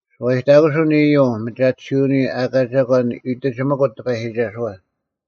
ᓱᐛᔨᑕᑯᓱᐤ ᐊᓐ ᐃᔪᐤ ᒥᒐᑎᓯᐅᓂᔪᐤ ᐊᑲ ᒐᒂᓐ ᐃᑎᒋᑎᒪᑯᑦ ᑎᐸᔨᒋᒐᓱᐛ,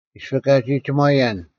ᐃᔅᐱ ᑲᒋ ᒋᒺᔭᓐ,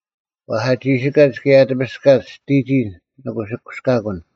ᐛᔅ ᐊ ᒋᓯᑲᒡ ᑭᔭ ᐊ ᑎᐱᔅᑲᒡ ᔅᑎᒋᔾ ᓂ ᑯᓯᑯᔅᑲᑯᓐ: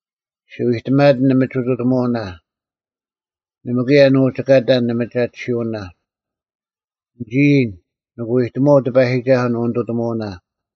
ᔅᒋ ᐎᑎᒪᑎᓐ ᓂᒥᒋᑐᑎᒧᐅᓇ, ᓇᒪ ᑭᔭ ᓂ ᐅᒋ ᑲᑕᓐ ᓂᒥᒐᑎᓯᐅᓇ᙮ ᓂᒋ ᐃᔨᓐ, ᓂᑭ ᐎᑎᒧᐛᐤ ᑎᐸᔨᒋᒐᓱᐤ ᓂᐅᓂᑐᑎᒧᐅᓇ;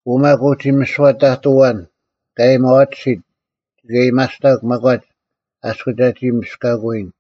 ᐅ ᒪᒃ ᐅᒋ ᒥᓯᐛ ᑕᑐᐤ ᐊᐛᓐ ᑲ ᐊᔭᒥᐊᐛᑎᓯᑦ ᒋᑭ ᐊᔭᒥᐊᔅᑕᒄ ᒪᒂᒡ ᐊᔅᒄ ᒐᒋ ᒥᔅᑲᑯᐎᔨᓐ: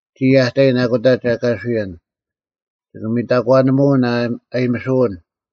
ᒋᔾ ᐊ ᑕᔨᓐ ᐊᑯᑕ ᒐ ᑲᓱᔭᓐ; ᒋᑭ ᒥᑕᒂᓂᒧᐅᓐ ᐊᔨᒥᓱᐅᓐ: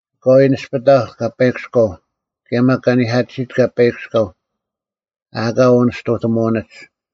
ᐊᑲᐎᔾ ᓇᔅᐱᑕᐧᒄ ᑲᐸᐃᑭᔎᐤ, ᑭᔭ ᒪᒃ ᑲᓂᐧᑲᑎᓯᑦ ᑲᐸᐃᑭᔎᐤ, ᐊ ᐊᑲ ᐅᓂᔅᑐᑎᒧᐅᓂᒡ: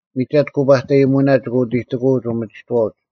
ᒥᒐᑦ ᑯᐸᑕᔨᑎᒧᐅᓇ ᒋᑭ ᐅᑎᑎᑯᐅᒡ ᐅᒥᒋᑥᐅᒡ: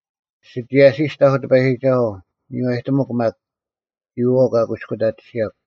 ᓯᒋᔭᓯᔅᑕᐧᒄ ᑎᐸᔨᒋᒐᓱᐤ, ᒥᔽᔨᑎᒧᒄ ᒪᒃ, ᒋᔨᐛᐤ ᑲ ᑯᐃᔅᑯᑕᑎᓯᔭᒄ: